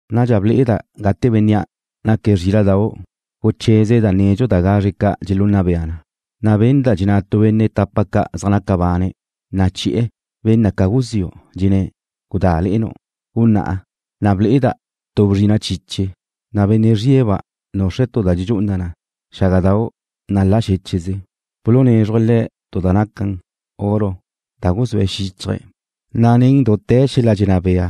Nadxa ble'eda' gate Bénnea' naque̱' Zríla'dau' gucheze̱' da nedxu da gazre ca' dxelunna bea na. Na' benda' dxenná tu benne' tapa ca' zaj naca bane̱', na' chi'e̱ ben na ca guziu', dxenné̱': ―Gudá, le'enu'. Gunná'a, na' ble'eda' tu bzrina' chiche, na' benne' zrie̱'-ba' nuxre̱' tu da dxedxú'una na xágadau' nalá xéche'ze. Bulunézruje̱' le̱' tu da naquen oro da guzúe' xíchaje̱', na' nen dute̱ xel-la' dxenná bea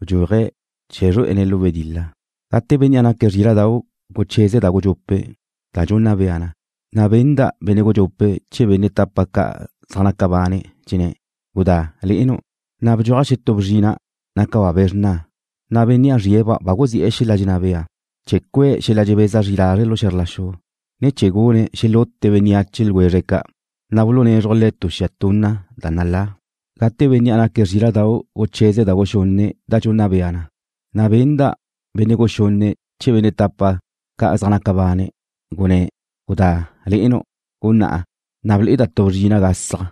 bdxuaje̱' chee̱ zrué'ene̱' lu wedil-la. Gate Bénnea' naque̱' Zríla'dau' gucheze̱' da gudxupe' da dxunna bea na, na' benda' benne' gudxupe' chee̱ benne' tapa ca' zaj naca bane', dxenné̱': ―Gudá, le'enu'. Na' bdxuaj xetú bzrina', nácaba' be̱ xrna, na' bénnea' zrie̱'-ba' guzi'e̱ xel-la' dxenná bea chee̱ cue̱' xel-la' dxebeza zri lazre' lu xe̱zr la xu, ne chee̱ gune̱' xelute bénneache ljwezre' ca', na' bulunézruje̱' le̱' tu xia tunna da nalá. Gate Bénnea' naque̱' Zríla'dau' gucheze̱' da guxunne' da dxunna bea na, na' benda' benne' guxunne' chee̱ benne' tapa ca' zaj naca bane', gunné̱': ―Gudá, le'enu'. Gunná'a, ne ble'eda' tu bzrina' gasaj,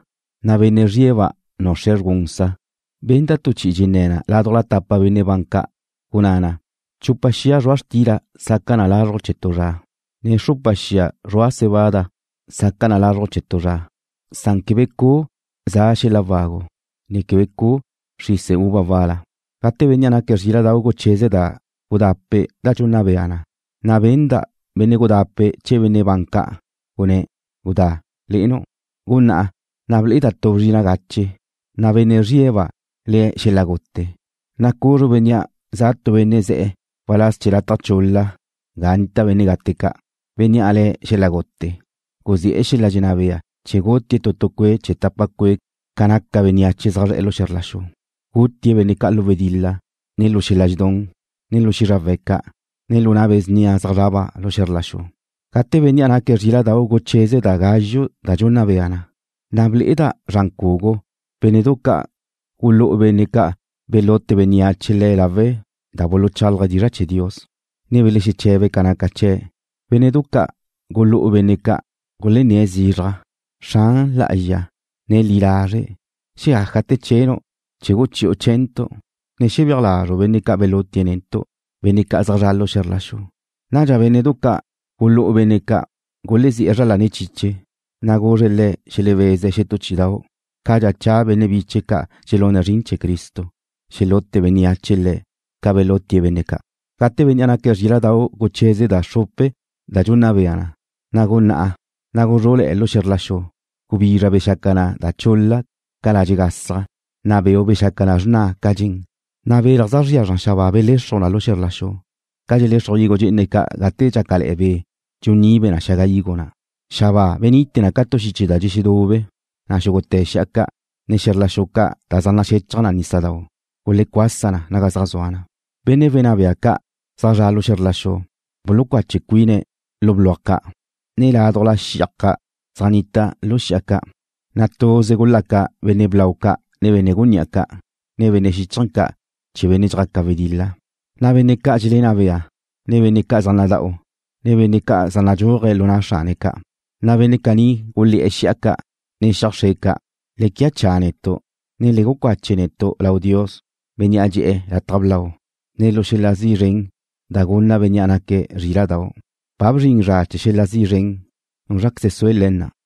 na' benne' zrie̱'-ba' nuxre̱' zrgú'unsa. Benda' tu chi'i dxenné̱ na ládujla tapa benne' ban ca', gunná na: ―Chupa xia zrua' xtila saca na lazruj chee̱ tu zra, ne xrupa xia zrua' cebada saca na lazruj chee̱ tu zra, san quebe cu' za xel-la' wagu, ne quebe cu' xrise uva wal-la. Gate Bénnea' naque̱' Zríla'dau' gucheze̱' da gudape' da dxunna bea na, na' benda' benne' gudape' chee̱ benne' ban ca', gunné̱': ―Gudá, le'enu'. Gunná'a, ne ble'eda' tu bzrina' gache, na' benne' zrie̱'-ba' le̱' Xel-la' Gute, na' cuzru bénnea' za tu benne' ze̱'e̱ waláz chee̱ lataj chul-la ga nnita benne' gate ca'. Bénnea' le̱' Xel-la' Gute guzi'e̱ xel-la' dxenná bea chee̱ gutie̱' tu cue' chee̱ tapa cue' ca naca bénneache zaj zre̱'e̱ xe̱zr la xu. Gutie̱' benne' ca' lu wedil-la, ne lu xel-la' dxedún, ne lu xízrawe̱' ca', ne lu na' be̱ snia zaj zraba' lu xe̱zr la xu. Gate Bénnea' naque̱' Zríla'dau' gucheze̱' da gázxue da dxunna bea na, na' ble'eda' zran cugu bénne'du ca' gulú'u benne' ca' belute bénneache le̱' lawe' da buluchálaje̱' dizra' chee̱ Dios, ne belexeche̱be̱' ca naca chee̱'. Bénne'du ca' gulú'u benne' ca' gulenné̱' zizraj: ―Xran lá'azxa, ne li lazre', ¿xeajáte̱ chenu' chee̱ guchi'u chee̱ntu', ne xebéaj lazru' benne' ca' belutie̱' netu', benne' ca' zaj zre̱'e̱ lu xe̱zr la xu? Nadxa bénne'du ca' gulú'u benne' ca' gulezí'e zra lane̱' chiche, na' guzre̱' le̱' xelebeze̱' xetú chí'idau', cadxa cha benne' biche̱' ca' dxelune̱' zrin chee̱ Cristo, xelute bénneache le̱' ca belutie̱' benne' ca'. Gate Bénnea' naque̱' Zríla'dau' gucheze̱' da xrupe da dxunna bea na, na' guná'a, na' guzrú'le̱'e̱ lu xe̱zr la xu. Gubizra bexaca na da chul-la ca ladxe' gasaj, na' beu' bexaca na xrna ca dxen, na' belaj zaj zria xabáa belexruj na lu xe̱zr la xu, ca dxelexruj higo dxe'ene ca' gate dxácale̱'e̱ be' dxunibe na xaga higo na'. Xabáa benite na ca tu xiche da dxexedube, na' xúgute̱ xi'a ca', ne xe̱zr la xu ca' da zaj naxechaj nísadau' gulecuasa na naga zaj zua na. Benne' wenná bea ca' zaj zre̱'e̱ lu xe̱zr la xu bulucache cuine̱' lu bluaj ca' ne ládujla xiaj ca' zaj nita lu xi'a ca', na' tuze gulaca benne' blau ca' ne benne' gunní'a ca', ne benne' xíchaje̱ ca' chee̱ benne' dxjaca wedil-la, ne benne' ca' dxelenná bea, ne benne' zaj nada'u, ne benne' zaj nadxúaje̱' lu na' xrane̱' ca', na' benne' caní gulé̱'e̱ xi'a ca', ne xiaj xre ca': ―Le quia cha netu', ne le gucache netu' lau Dios, Bénnea' dxe'e̱ lataj blau, ne lu xel-la' zi' zren da gunna Bénnea' naque̱' Zríla'dau'. Ba bzrin zra chee̱ xel-la' zi' zren. ¿Núzraqueze sue le̱ na?